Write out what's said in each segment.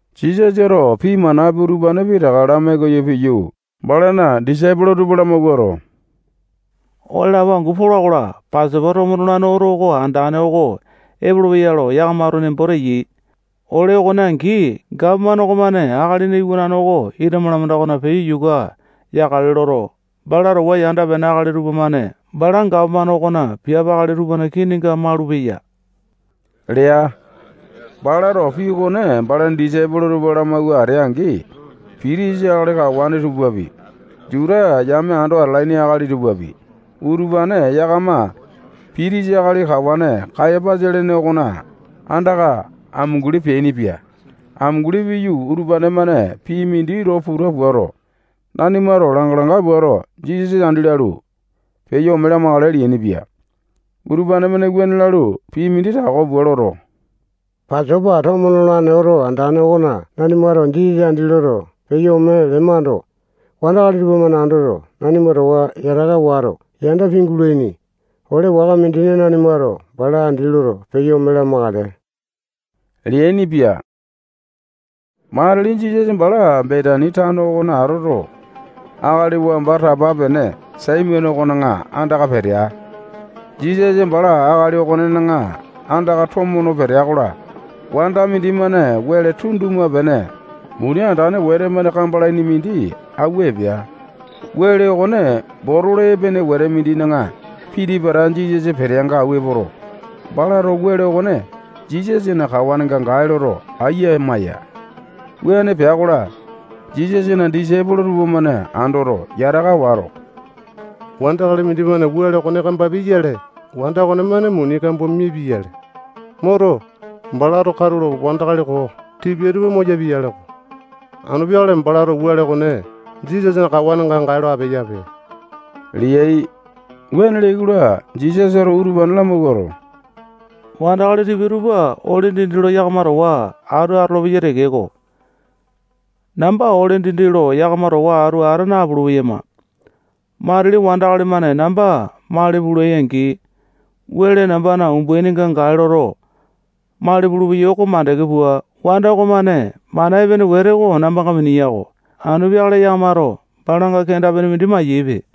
Jisasato pii manapi utupane pitaka lamai koyo piyu, balana disaipolo tupa lamawuato, ole lapo angu pola-kola, Pasopa tomo nolane oto andane oko epolopeya lo yakamato nembo teyai. Ole okone angi, gapomane okomane Akalina Iwanane oko ita malamanda okona peyo yuka yakale loto, bala towa yanda-pene akali tupamane bala gapomane okona piape akali tupana kininga malupeya lea. Balato pii okone balana disaipolo tupa lamawua atea-angi, pitisa akali kawane tupapi, Juta yame ando atalaini akali tupapi, utupane yakama pitisa akali kawane Kayapasa lene okona andaka amunguli peainipia. Amunguli piyu, utupane-mane pii mindi lo puta puato, nanimato langa-langa puato, Jisasa andi lalu, peyo ome lamakale leainipia. Utupane-mane wuane lalu, pii mindi tako pua loto, Pasopa tomo nolane oto andane okona nanimato Jisasa andi loto, peyo ome lemando, wandakali tupamane andoto, nanima towa yataka wato, yanda pingulaini. Ole waka mindina, nanimato bala andi loto, peyo ome lamakale leainipia. Matili Jisasa bala Betani tano okona atoto, akali wamba tapa peane Saimone okona andaka petea. Jisasa bala akali okonena andaka tomo no petea-kola, wanda mindimane wele tunduma-pene muni andane wete-mane kambalaini mindi awua epea. Wele okone botolo epene wete mindina piti-pata Jisasa peteanga awua epoto, balato wele okone Jisasana kawanenga gae loto, aiya maya. Wuane pea-kola, Jisasana disaipolo tupamane andoto, yataka wato, wandakali mindimane wele okone kambapia-yale, wanda okonemane muni kambua mipia-yale. Moto, balato katulo wandakali koo tipia tupa moyapia-yaleko. Anu peakale balato wele okone Jisasana kawanenga gae lo apeyape leai. Wuane leai-kola, Jisasato utupane lamawuato, wandakali tipia tupa ole dindi lo yakama towa atu atolopeyai tekeko, namba ole dindi lo yakama towa atu ata napulu-peyama. Matili wandakali-mane namba mali pulai-angi, wele nambana umbaininga gae loto, mali pulupeyai oko makande pua, wanda okomane mana epene wete oko nambanga miniya-ko. Anu peakale yakamato balanga kenda-pene mindi mayaipe.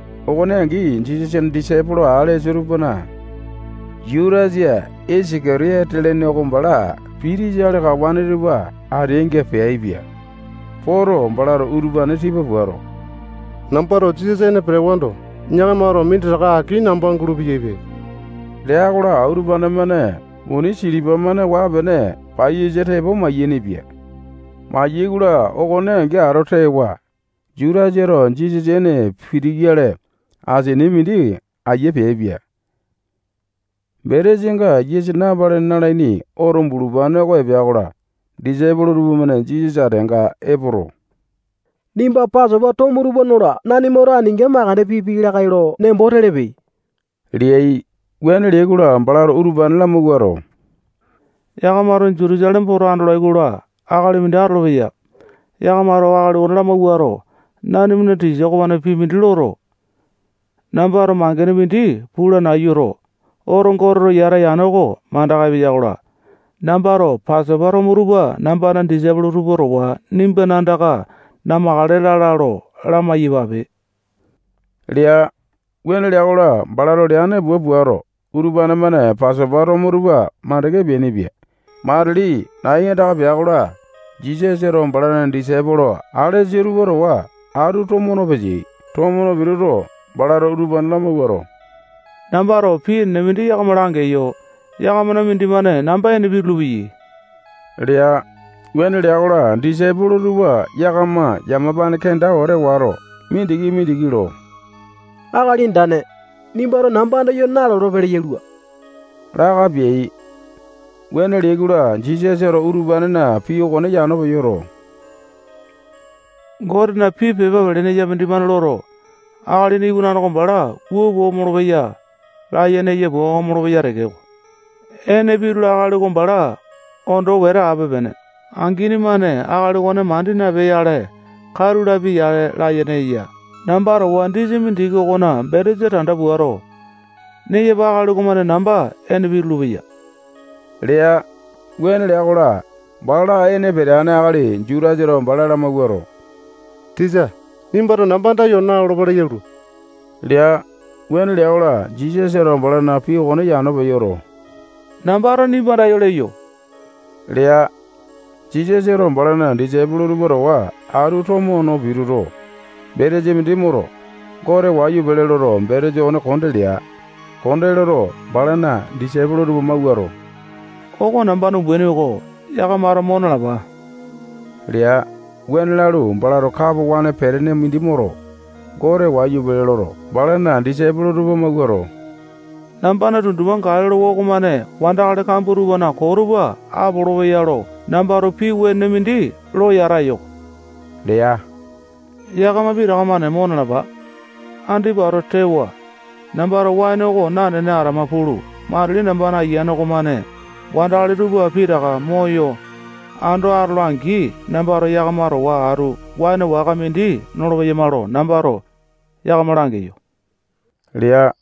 Okone angi, Jisasana disaipolo alesa akali tupana Jutasa Isaka-tiyote lene oko bala pitisa akali kawane tupa ateainga peaipia. Poto, balato utupane tipa puato, nambato Jisasa ene petewando, yakamato aki minditaka namba gulu-peyaipe lea-kola, utupane-mane muni silipa-mane waa-pene paiyasa tepo mayainipia. Mayai-kola, okone angi ato tewa, Jutasato Jisasa ene pituyale asini mindi aiya peaipia. Betesanga yisa napalene nalaini oto bulupane oko epea-kola, disaipolo tupamane Jisasa ateanga epoto, nimba Pasopa tomo tupa nola nanimato aninga makande pipiai lakae lo nembo telepe leai. Wuane leai-kola, balato utupane lamawuato, yakamato Jutusaleme poto andolai-kola, akali mindi atolopeya. Yakamato akali okone lamawuato, nanimana tisa okomane pii mindi loto, nambato mangene mindi pula nayuto, oto Goteto yata yane oko mandaka epeya-kola, nambato Pasopa tomo tupa nambana disaipolo tupa towa nimbana andaka namakale lala lo lamai-yapape lea. Wuane lea-kola, balato leane pua puato, utupane-mane Pasopa tomo tupa makande peainipia. Matili nai andaka pea-kola, Jisasato balana disaipolo alesa tupa towa atu tomo no peteai. Tomo no pituto, balato utupane lamawuato, nambato pii enene mindi yakama langeyo. Yakamana mindimane namba ene pitulu-peyai lea. Wuane lea-kola, disaipolo tupa yakama yamapane kenda wete wato, mindiki-mindiki lo Akali Andane, nimbato namba andayo nalolo-pele yalua laka peai. Wuane leai-kola, Jisasato utupanena pii okone yano peyoto, Gotena pii pepa pelene eya mindimane loto, Akalina Iwanane oko bala wua pua omolo-peya layene eya pua omolo-peya tekeko, ene pitula akali oko bala ondo wete ape-pene. Angini-mane akali okone mandi napea-yale, katu lapia-yale layene eya. Namba towa disa mindiki okona betesa tanda puato, neyapa akali okomane namba ene pitulu-peya lea. Wuane lea-kola, bala ene peteane akali Jutasato bala lamawuato, tisa, nimbato namba andayo nalolo-pele yalua lea. Wuane lea-kola, Jisasato balana pii okone yano peyoto, nambato nimba andayo leyo lea. Jisasato balana disaipolo tupa towa atu tomo no pituto, betesa mindi moto, Gote wayu pele loto, betesa okone konde lea. Konde loto, balana disaipolo tupa mawuato, oko nambana umbaini oko. Yakamato mo nalapa lea. Wuane lalu, balato kapo waene petene mindi moto, Gote wayu pele loto, balana disaipolo tupa mawuato, nambana tundupa gae lolowa okomane wandakali kambua tupana koo tupa apolopeya lo nambato pii wenene mindi lo yata eyo-ko lea. Yakama pitaka-mane mo nalapa. Andipa ato tewa, nambato waene oko nanene atama pulu, matili nambana Ayiane okomane wandakali tupa pitaka moyo ando atola-angi, nambato yakama towa atu waene waka mindi nolo-peyama lo nambato yakama langeyo lea.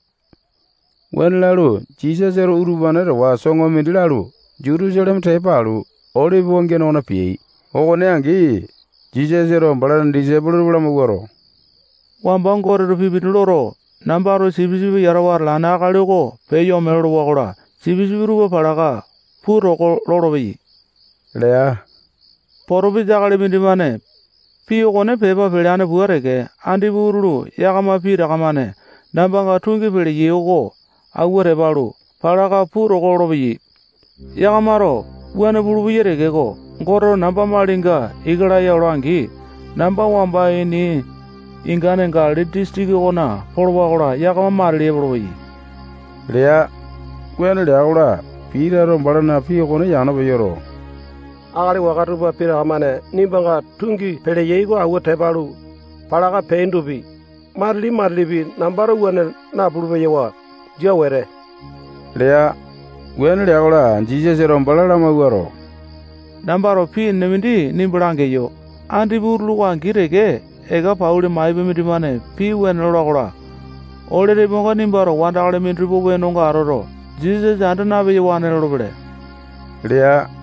Wuane lalu, Jisasato utupane towa soŋo mindi lalu, Jutusaleme tepa alu, Olipi wangiane okona peai. Okone angi, Jisasato balana disaipolo tupa lamawuato, wamba Goteto pii mindi loto, nambato sipisipi yatawa atalane akali oko peyo ome lolowa-kola, sipisipi tupa palaka puu toko lolopeyai lea. Potopesa akali mindimane pii okone pepa peleane pua teke, andipa utulu yakama pitaka-mane nambanga tungi peleyai oko awua tepa alu, palaka puu toko lolopeyai. Yakamato wuane pulupeyai tekeko, Goteto namba malinga ika laya ola-angi, namba wamba ini ingane Galili disitiki okona polowa-kola, yakama matili epolopeyai lea. Wuane lea-kola, Pitato balana pii okone yano peyoto, akali waka tupa pitaka-mane nimbanga tungi peleyai oko auwu tepa alu, palaka peaindopi, matili-matilipi nambato wuane napulu-peyawa. Jia wete lea. Wuane lea-kola, Jisasato bala lamawuato, nambato pii enene mindi nimba langeyo. Andipa utulu oko angi teke eka pauli maipa mindimane pii wene lola-kola, ole tepoainga nimbato wandakali minditupana wenonga atoto, Jisasa anda na-peyawane lolopele lea.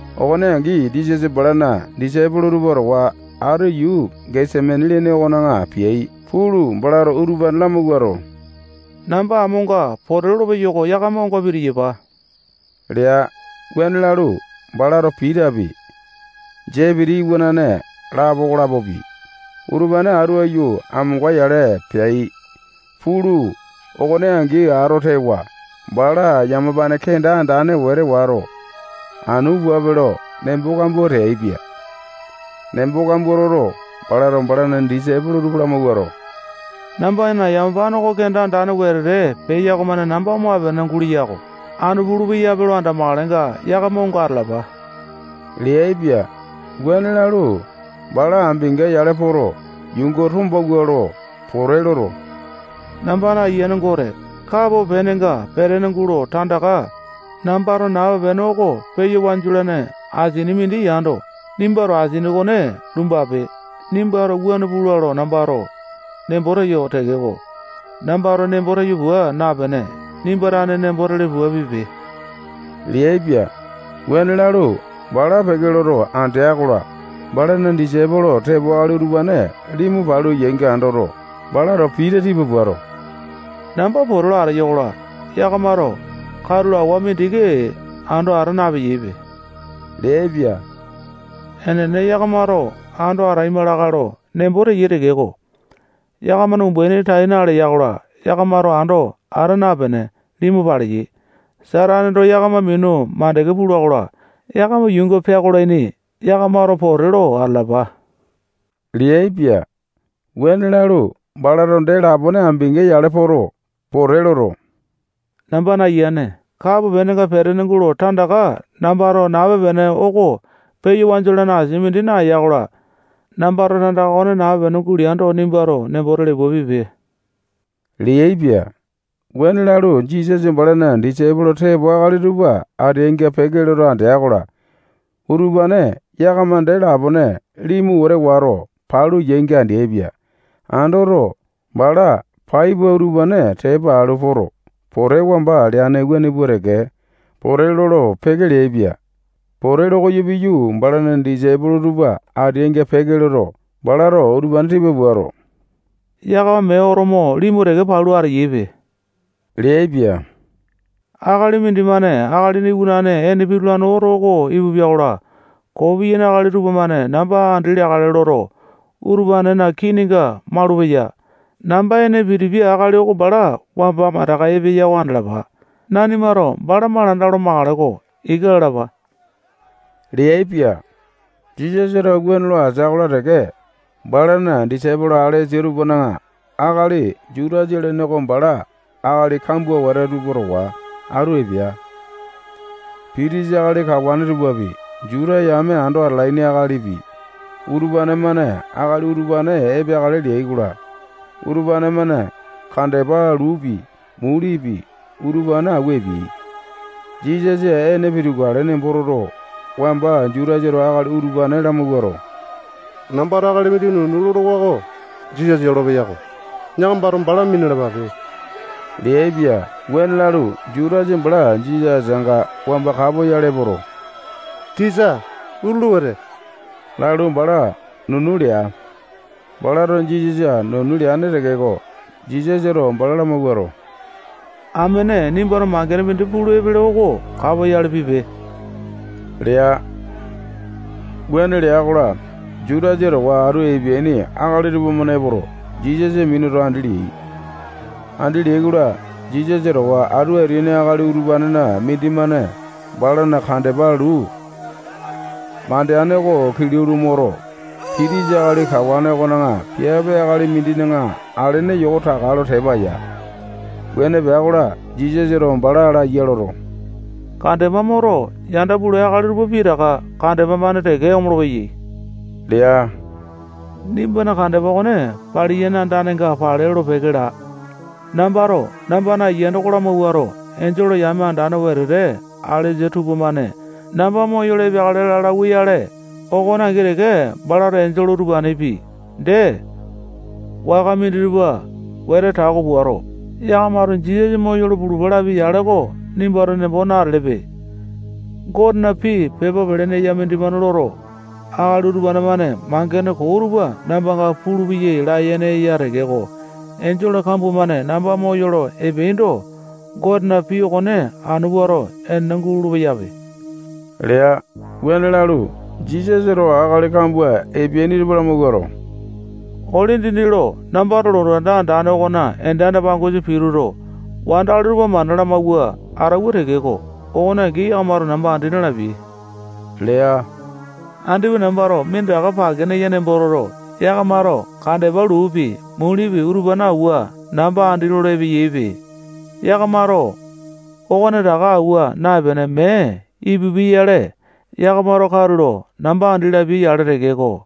Okone angi, Jisasa balana disaipolo tupa towa atu yuu Gesemani lene okona peai. Pulu, balato utupane lamawuato, namba amonga pote lolo peyo-ko. Yakama onga pitiyapa lea. Wuane lalu, balato Pitapi, Sepiti iwanane lapo okolapopi, utupane bala atu aiyu amonga-yale peai. Pulu, okone angi ato tewa, bala yamapane kenda andane wete wato, anu puape lo nembo kambua teaipia. Nembo kambua toto, balato balana disaipolo tupa lamawuato, nambana yamapane oko kenda andane wetete peya okomane namba omape-pene gulalua-ko. Anu pulu-peyape lo andamakalenga, yakama onga atalapa leaipia. Wuane lalu, bala ambinga-yale poto, yuunga tombawua lo pote loto, nambana Ayiane Gote, kapo penenga petene gulo tandaka nambato nape-pene oko peya wanju olane asini mindi yando, nimbato asini okone lumbape. Nimbato wuane pula lo nambato nembo teyo tekeko, nambato nembo teyo pua napene, nimba tane nembo tele pua pipe leaipia. Wuane lalu, bala peke loto andea-kola, balana disaipolo tepo akali utupane limu palu yainga andoto, balato Pita tipa puato, namba pote lo ateyo-kola, yakamato katulo awa mindiki ando ata napeyaipe leaipia. Enene, yakamato ando ataima lakae lo nembo teyai tekeko, yakamana umbaini tai naleya-kola, yakamato ando ata napene, limu paleyai. Sataneto yakama minu makande pula-kola, yakama yuunga peakolaini. Yakamato pote lo atalapa leaipia. Wuane lalu, balato dee lapone ambinga-yale poto, pote loto, nambana Ayiane, kapo penenga petene gulo tandaka nambato nape-pene oko peya wanju olane asini mindi nayola-kola, nambato tandaka okone nape-pene guleando, nimbato nembo tele pua pipe leaipia. Wuane lalu, Jisasa balana disaipolo tepo akali tupa ateainga peke loto andea-kola, utupane yakama dee lapone limu wete wato, palu yainga andeaipia. Andoto, bala pai pua utupane tepa alu poto, pote wamba leane wuane pua teke pote lolo-peke leaipia. Pote lokoyo piyu, balana disaipolo tupa ateainga peke loto, balato utupane tipa puato, yakama mee oto mo limu teke palu ateyaipe leaipia. Akali mindimane Akalina Iwanane ene pitulane oto oko ipupia-kola, koo piyaini akali tupamane namba andi leakale loto, utupanena kininga malupeya. Namba ene pitipia akali oko bala wamba mandaka epeya oko andalapa. Nanimato bala malanda olo makale-ko. Ika lalapa leaipia. Jisasato wuane lo atea-kola teke, balana disaipolo alesa tupana akali Jutasa lene oko bala akali kambua wete tupa towa atu epea. Pitisa akali kawane tupapi, Juta yame ando atalaini akalipi, utupane-mane akali utupane epeakale leai-kola, utupane-mane kandepa luupi, mulipi, utupane awua epeai. Jisasa ene pitukale nembo toto, wamba Jutasato akali utupane lamawuato, nambato akali mindi nunu lolowa oko Jisasa yolopeya-ko. Yakamato bala minalapape leaipia. Wuane lalu, Jutasa bala Jisasa ateanga wamba kapoyale epoto, tisa, utulu wete lalu, bala nunu lea. Balato Jisasa nunu leane tekeko, Jisasato bala lamawuato, amene, nimbato mangene mindi pulu epele oko kapoyale pipe lea. Wuane lea-kola, Jutasa towa atu epeaini akali tupamane epoto, Jisasa minuto, andi leai. Andi leai-kola, Jisasa towa atu ateaini akali utupanena mindimane balana kandepa luu mandeane oko kilau lo moto, pitisa akali kawane okona piape akali mindina alene yoko taka lo tepa yaa. Wuane pea-kola, Jisasato bala laya loto, kandepa moto, yanda pulai akali tupa pitaka kandepa-mane teke omolo-peyai lea. Nimbana kandepa okone paliyane andanenga pale lolo-peke laa. Nambato nambana ayiane oko lamawuato, enjole yame andane wetete alesa tupamane namba moyolo epeakale laa lauwa-yale, oko angi teke balato enjole utupanepi, dee waka minditupa wete tako puato, yakamato Jisasa moyolo pulupa lapia-yale oko nimbato nembo natelepe. Gotena pii pepa pelene eya mindimane loto, akali utupa-mane mangene koo utupa nambanga pulupeyai layene eya tekeko, enjole kambua-mane namba moyolo epeaindo, Gotena pii okone anu puato, enene gulolo-peyape lea. Wuane lalu, Jisasato akali kambua epeaini tupa lamawuato, ole dindi lo nambato lotu anda andane okona ende anda-pangosa pituto, wandakali tupa mana lamawua atauwa tekeko, okone angi, yakamato namba andi na-lapiai lea. Andipa nambato minditaka pake neya nembo toto, yakamato kandepa luupi, mulipi, utupane awua, namba andi lolo epeyaipe. Yakamato okonetaka awua naepene, mee ipupiai-yale, yakamato katulo namba andi lapia-yale tekeko,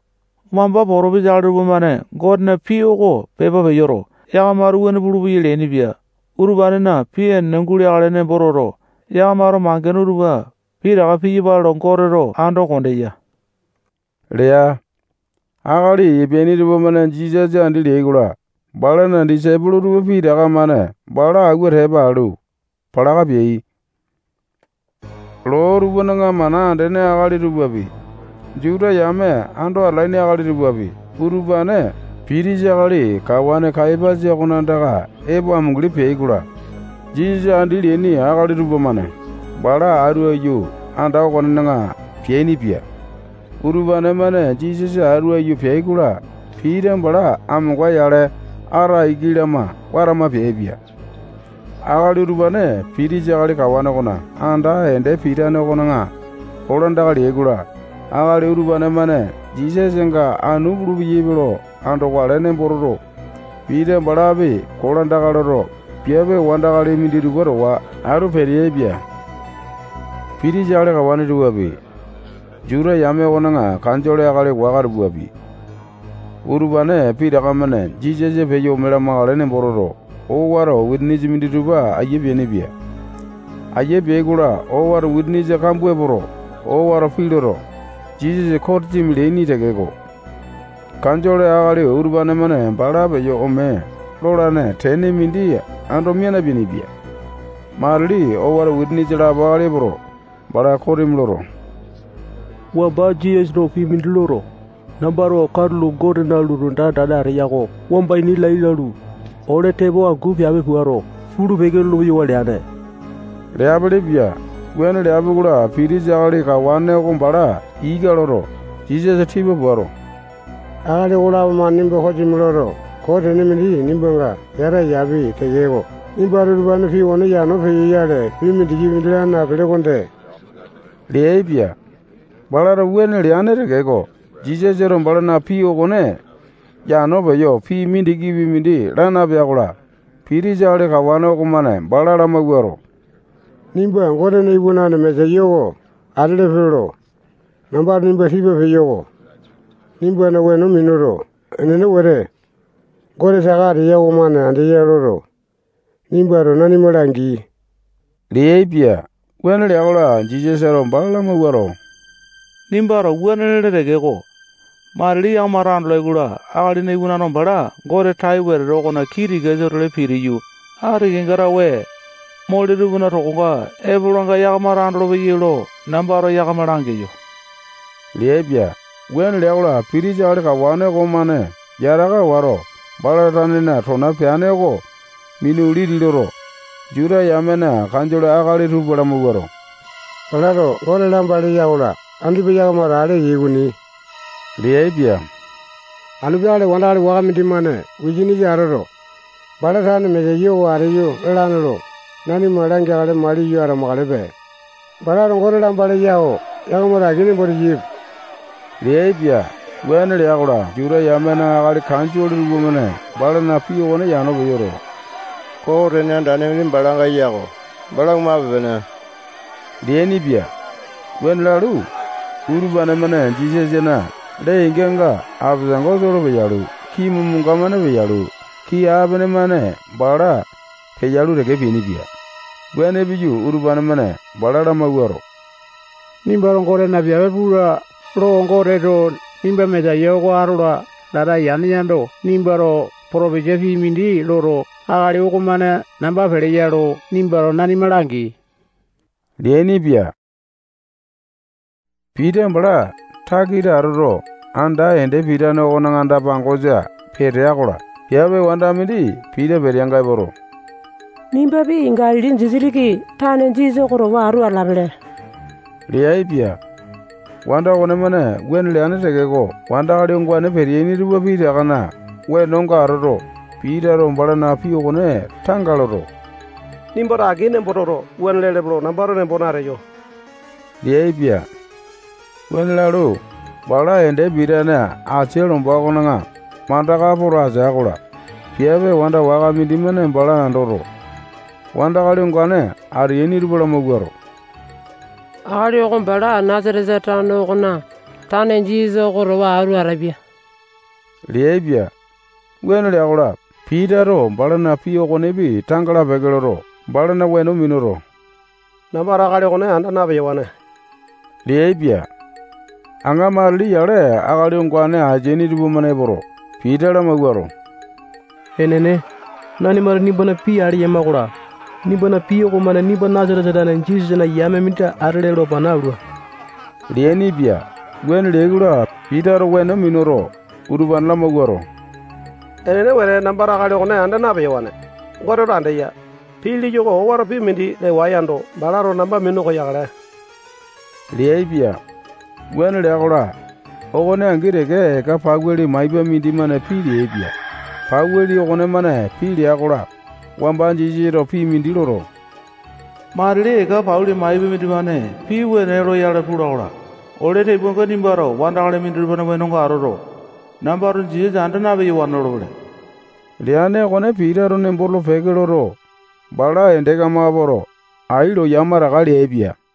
wamba potopesa akali tupamane Gotena pii oko pepa peyoto, yakamato wuane pulupeyai leainipia. Utupanena pii enene guleakale nembo toto, yakamato mangene utupa pitaka piyapale lo Goteto ando kondeya lea. Akali epeaini tupamane Jisasa andi leai-kola, balana disaipolo tupa pitaka-mane bala awua tepa alu, palaka peai. Loo tupana mana andene akali tupapi, Juta yame ando atalaini akali tupapi, utupane pitisa akali kawane Kayapasa okona andaka epo amunguli peai-kola, Jisasa andi leaini akali tupamane bala atu aiyu anda okonena peainipia. Utupane-mane Jisasa atu aiyu peai-kola, Pita bala amonga-yale ata iki lama watama peaipia. Akali utupane pitisa akali kawane okona anda ende pitane okona kolandaka leai-kola, akali utupane-mane Jisasanga anu pulu-peyaipe lo andokale nembo toto, Pita balapi kolandaka loto, piape wandakali minditupa towa atu peteaipia. Pitisa akali kawane tupapi, Juta yame okona kanjole akali waka tupapi, utupane pitaka-mane Jisasa peyo ome lamakale nembo toto, owato wisanisa minditupa aiya peainipia. Ayia peai-kola, owato wisanisa kambua epoto, owato pii loto, Jisasa kosimi leaini tekeko, kanjole akali utupane-mane bala peyo ome lolane tene mindi ando mia napeainipia. Matili owato wisanisa lapo akali epoto, bala kosimi loto, wamba Jisasato pii mindi loto, nambato katulo Gotena lotu anda andane ateya oko wamba ini lai lalu, ole tepo angu piape puato, pulu-peke lolo-peyawa leane leapilipia. Wuane leapi-kola, pitisa akali kawane oko bala ika loto, Jisasa tipa puato, akali okolapo-mane nimba kosimi loto, koo tene mindi nimbanga yata eyapi tekeko, nimbato utupanena pii okone yano peyoyale, pii mindikipi mindi laa napele okonde leaipia. Balato wuane leane tekeko, Jisasato balana pii okone yano peyo, pii mindikipi mindi laa napea-kola, pitisa akali kawane okomane bala lamawuato, nimba Gotena Iwanane Mesaya oko atelepe lo nambato nimba tipa peyo-ko. Nimbana weno minuto, enene wete, Gote saka ateya okomane andeya loto, nimbato nanima langi leaipia. Wuane lea-kola, Jisasato bala lamawuato, nimbato wuane lele tekeko, matili yakamato andolai-kola, Akalina Iwanane oko bala Gote tai wetete okona kii tikasa-tole pitiyu, ati kenga tawe mole tupana tokonga epolanga yakamato andolopeyai lo nambato yakama langeyo leaipia. Wuane lea-kola, pitisa akali kawane okomane yataka wato, bala tanena tona peane oko minu liti loto, Juta yamena kanjole akali tupa lamawuato, balato Gote lamba leya-kola, andipa yakamato ale eyai okoni leaipia. Anu peakale wandakali waka mindimane wisanisa atoto, bala tane Mesaya oko ateyo lalane lo nanima langeakale maliyo atamakalepe. Balato Gote lamba leya-ko. Yakamato aki nembo teyaipe leaipia. Wuane lea-kola, Juta yamena akali kanjole tupamane balana pii okone yano peyoto, koo tene andane mindi balanga eya-ko. Bala omape-pene leainipia. Wuane lalu, utupane-mane Jisasana lee-inganga apesango soo lo peyalu, kii momanga-mane peyalu, kii apene-mane bala peyalu teke, peainipia. Wuane piyu, utupane-mane bala lamawuato, nimbato Gotena piape pula lo Goteto nimba Mesaya oko atola lata yane yando, nimbato potopesa pii mindi loto, akali okomane namba peleya lo nimbato nanima langi leainipia. Pita bala takita atoto, anda ende pitane okona anda-pangosa petea-kola, piape wanda mindi Pita peteanga epoto, nimbapi Galili disitiki tane Jisasa oko towa atu atalapele leaipia. Wanda okonemane wuane leane tekeko, wandakali ongane peteaini tupa pitakana wenonga atoto, Pitato balana pii okone tanga loto, nimbato aki nembo toto, wuane lelepe lo nambato nembo nateyo leaipia. Wuane lalu, bala ende pitane asia lomba okona mandaka poto atea-kola, piape wanda waka mindimane bala andoto, wandakali ongane ateaini tupa lamawuato, akali oko bala Nasatesa tano okona tane Jisasa oko towa atu atapia leaipia. Wuane lea-kola, Pitato balana pii okonepi tanga lapeke loto, balana weno minuto, nambato akali okone anda na-peyawane leaipia. Aŋa matili yale akali ongane ateaini tupamane epoto, Pita lamawuato, enene, nanimato nimbana pii ale eyama-kola, nimbana pii okomane nimba Nasatesa tane Jisasana yame mindi atele lo pana alua leainipia. Wuane leai-kola, Pitato weno minuto, utupane lamawuato, enene wete, nambato akali okone anda na-peyawane. Goteto andeya. Pii leyo oko owato pii mindi lewae yando, balato namba minu koyakale leaipia. Wuane lea-kola, okone angi teke eka pauli maipa mindimane pii leaipia. Pauli okonemane pii lea-kola, wamba Jisasato pii mindi loto, matili eka pauli maipa mindimane pii wene loyale pula-kola, ole tepoainga nimbato wandakali minditupana wenonga atoto, nambato Jisasa anda na-peyawane lolopele leane okone Pitato nembo tolo-peke loto, bala ende kamaka poto, ai lo yamataka leaipia.